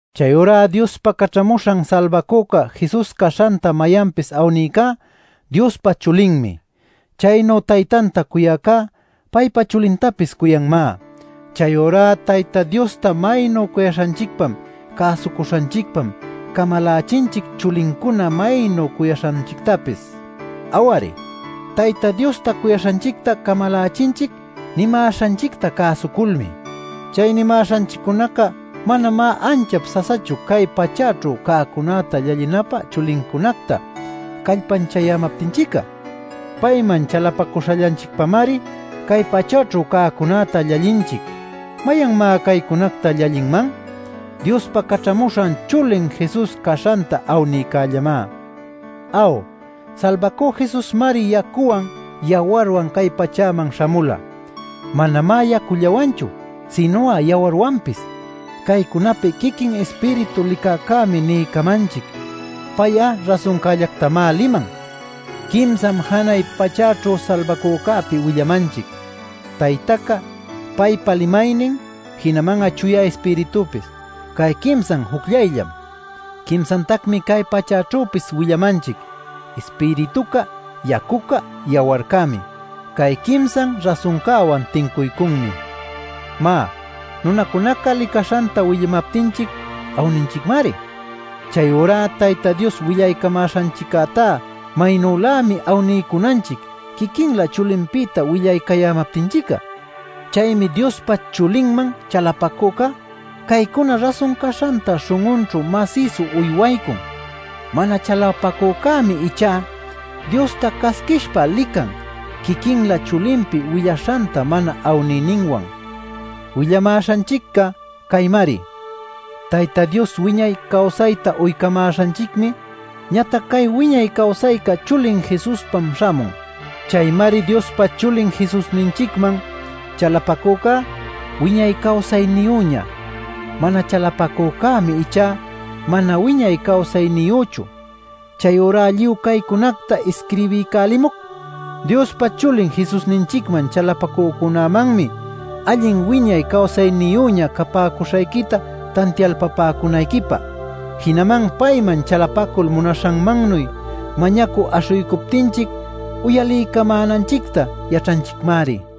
Chayurá Diospa Caćhamuśhan Salbacüca Jesus caśhanta mayanpis awnïcá Diospa chulinmi. Chaynu Taytanta cuyäcá, paypa chulintapis cuyanmá. Chayurá Tayta Diosta maynu cuyaśhanchicpam cäsucuśhanchicpam camalachinchic chulincunacta maynu cuyaśhanchictapis. Aw-ari, Tayta Diosta cuyaśhanchicta camalachinchic nimäśhanchicta cäsuculmi. Chay nimäśhanchiccunaca manamá anchap sasachu cay pachäćhu cäcunäta llallinapä chulincunacta callpanchayämaptinchic'a. Payman chalapacuśhallanchicpamari cay pachäćhu cäcunäta llallinchic. ¿Mayanmá caycunacta llallinman? Diospa caćhamuśhan chulin Jesus caśhanta awnïcällamá. Aw, Salbacü Jesusmari yacuwan, yawarwan cay pachäman śhamula. Manamá yacullawanchu, sinu'a yawarwanpis. Caycunapi quiquin Ispiritu licäcämi niycamanchic. Pay'a rasuncällactamá liman. ˻Quimsam janay pachäćhu Salbacücäpi willamanchic: Taytaca, paypa Limaynin, jinaman Chuya Ispiritupis. Cay quimsan jucllayllam.˼ Quimsatacmi cay pachäćhüpis willamanchic: Ispirituca, yacuca, yawarcämi. Cay quimsan rasuncäwan tincuycunmi. Má, nunacunaca licaśhanta willamaptinchic awninchicmari. Chayurá Tayta Dios willaycamäśhanchiccätá maynülämi awniycunanchic quiquinlä chulinpïta willaycayämaptinchic'a. Chaymi Diospa Chulinman chalapacücá caycuna rasun caśhanta śhun'unćhu masïsu uywaycun. Mana chalapacücämi ichá Diosta casquishpa lican quiquinlä chulinpi willaśhanta mana awniyninwan. Willamäśhanchicca caymari: Tayta Dios wiñay cawsayta uycamäśhanchicmi ñatac cay wiñay cawsayca chulin Jesuspam śhamun. Chaymari Diospa Chulin Jesusninchicman chalapacücá wiñay cawsayniyüña. Mana chalapacücämi ichá mana wiñay cawsayniyüchu. Chayurá lluy caycunacta isquirbiycälimuc Diospa Chulin Jesusninchicman chalapacücunämanmi allin wiñay cawsayniyüña capäcuśhayquita tantialpapäcunayquipä. Jinaman payman chalapacul munaśhanmannuy mañacü aśhuycuptinchic uyaliycamänanchicta yaćhanchicmari.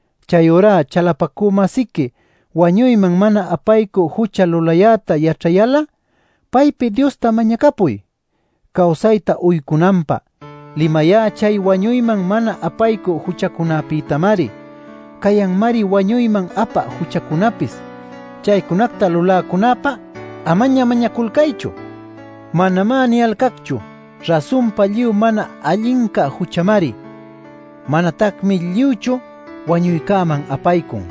Chayurá chalapacü-masiqui wañuyman mana apaycü jucha lulayäta yaćhayal'a paypi Diosta mañacapuy cawsayta uycunanpä. Limayá chay wañuyman mana apaycü juchacunapïtamari. Cayanmari wañuyman apä juchacunapis. Chaycunacta luläcunäpä “Amaña mañaculcaychu” manamá niyalcacchu. Rasunpa, lluy mana allinca juchamari; manatacmi lluychu wañuycäman apaycun.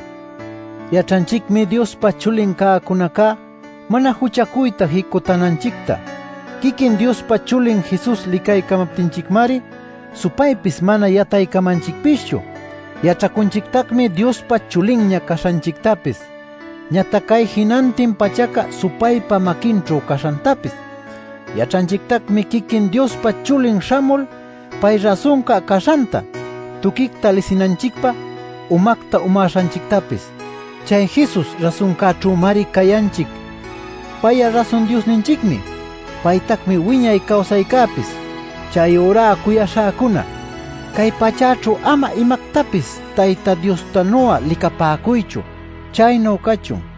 Yaćhanchicmi Diospa chulin cäcunacá mana juchacuyta jicutänanchicta. Quiquin Diospa Chulin Jesus licaycamaptinchicmari supaypis mana yataycamanchicpischu. Yaćhacunchictacmi Diospa chulinña caśhanchictapis ñatac cay jinantin pachaca supaypa maquinćhu caśhantapis. Yaćhanchictacmi quiquin Diospa Chulin śhamul pay rasunca caśhanta tuquicta lisinanchicpä umacta umäśhanchictapis. Chay Jesus rasuncäćhümari cayanchic. Pay'a rasun Diosninchicmi; paytacmi wiñay cawsaycäpis. Chayurá cuyaśhäcuna, cay pachäćhu ama imactapis Tayta Diostanu'a licapäcuychu. Chaynu cachun.